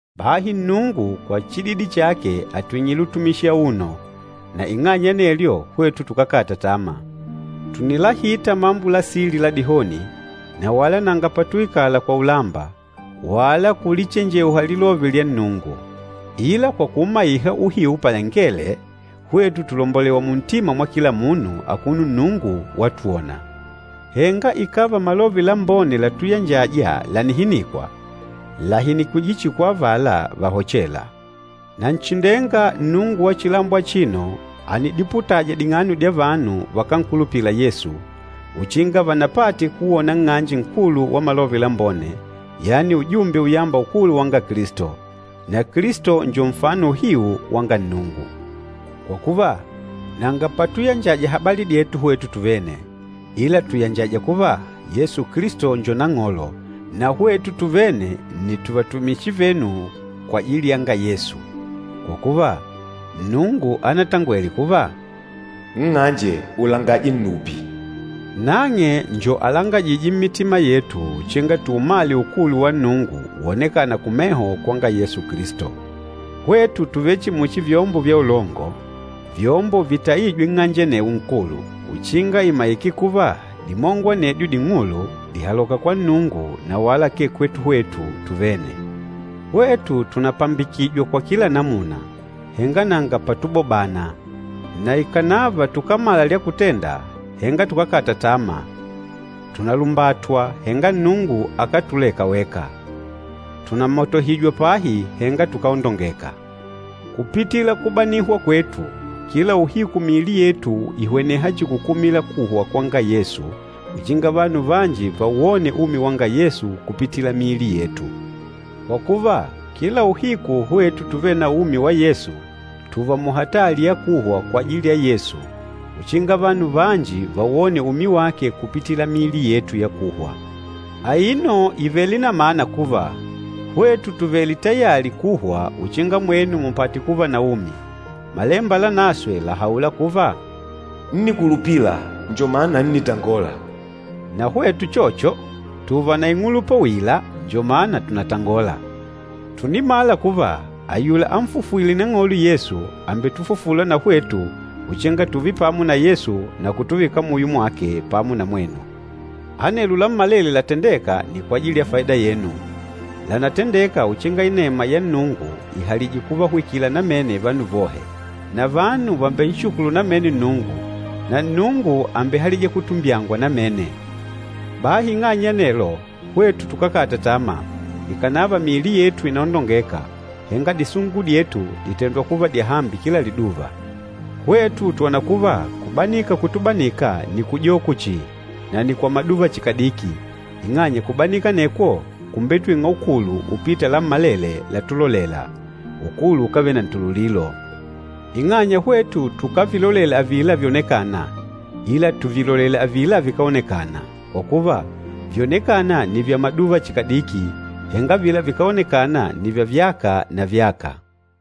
Bahi Nnungu, kwa chididi chake, àtwing'ile utumishi auno, na ing'anya ya anelyo hwetu tukákata tama. Tùnilahita mambo la sili la dihoni, na wala nanga patuikala kwa ulamba, wala kulichenjeuha lilove lyanga Nnungu. Ila kwa kùumaiha uhiu palangele, hwetu tùlombolewa muntima mwa kila munu, akuno Nnungu watwona. Henga ikàva Malove Lambone latuyanjaja lànihinikwa, làhinikwije chihi kwa avala vahochêla. Nanchindenga, nnungu wa chilambo achino ànidiputaja ding'ano dya vanu vakánkulupila Yesu, uchinga vanapate kuwona nng'anje nkulu wa Malove Lambone, yani ujumbe uyamba ukulu wanga Kilisto. Na Kilisto njo nfano uhiu wanga Nnungu. Kwa kuva, nanga patuyanjaja habali dyetu hwetu tuvene, ila tùyanjaja kuva, Yesu Kilisto njo Nang'olo, na hwetu tuvene nni tuvatumishi venu kwajili yanga Yesu. Kwa kuva, Nnungu anatangwele kuva, “Nng'anje ulangaje nnupi,” nang'e njo alangajîje mmitima yetu uchinga tuumale ukulu wa Nnungu wonekana kumeho kwanga Yesu Kilisto. Hwetu tùvele chihi muchi vyombo vya ulongo, vyombo vitaîjwe nng'anje anewo nkulu, uchinga imaike kuva dimongo anedyo ding'ulu dìhaloka kwa Nnungu na wala akee kwetu hwetu tuvene. Hwetu tùnapambikijwa kwa kila namuna, henga nanga patubobana, na ikànava tukámala lya kutenda, henga tukákata tama, tùnalumbatwa, henga Nnungu akátuleka weka, tùnamatohijwa pahi, henga tukáondongeka. Kupitila kubanika kwetu, kila uhiku miili yetu ìhweneha chihi kukumila kuhwa kwanga Yesu uchinga vanu vanji vawone umi wanga Yesu kupitila miili yetu. Kwa kuva, kila uhiku hwetu tuvêle na umi wa Yesu, tùùva muhatali ya kuhwa kwajili ya Yesu uchinga vanu vanji vawone umi wake kupitila miili yetu ya kuhwa. Aino ìvele na mana kuva, hwetu tùvele tayali kuhwa uchinga mwenu mupate kuva na umi. Malemba Lanaswe làhaula kuva, “Ńnikulupila, njo mana ńnitangola.” Na hwetu uchocho, tùùva na ing'ulupa uila, njo mana tùnatangola. Tùnimala kuva ayula anfufwîle Nang'olo Yesu, àmbetufufula na hwetu uchinga tùùve pamo na Yesu na kutuvika muyo mwake pamo na mwenu. Anelo lammalele latendêka nni kwajili ya faida yenu. Lànatendeka uchinga inema yanga Nnungu ihalije kuvahwikila namene vanu vohe. Na vanu vàmbenshukulu namene Nnungu, na Nnungu àmbehalija kutumbyangwa namene. Bahi ing'anya ya anelo, hwetu tukákata tama. Ikànava miili yetu ìnaondongeka, henga disungu dyetu dìtendwa kuva dyahambi kila liduva. Hwetu twòna kuva kubanika kutubanika nni kujoko chihi na nni kwa maduva chihi kadiki, ing'anya kubanika anekwo kùmbetwing'a ukulu upîta lammalele látulolêla, ukulu ukávele na ntululilo. Ing'anya hwetu tukávilolela avila vyonekâna, ila tùvilolela avila vikáonekana. Kwa kuva, vyonekâna nni vya maduva chihi kadiki, henga avila vikáonekana nni vya vyaka na vyaka.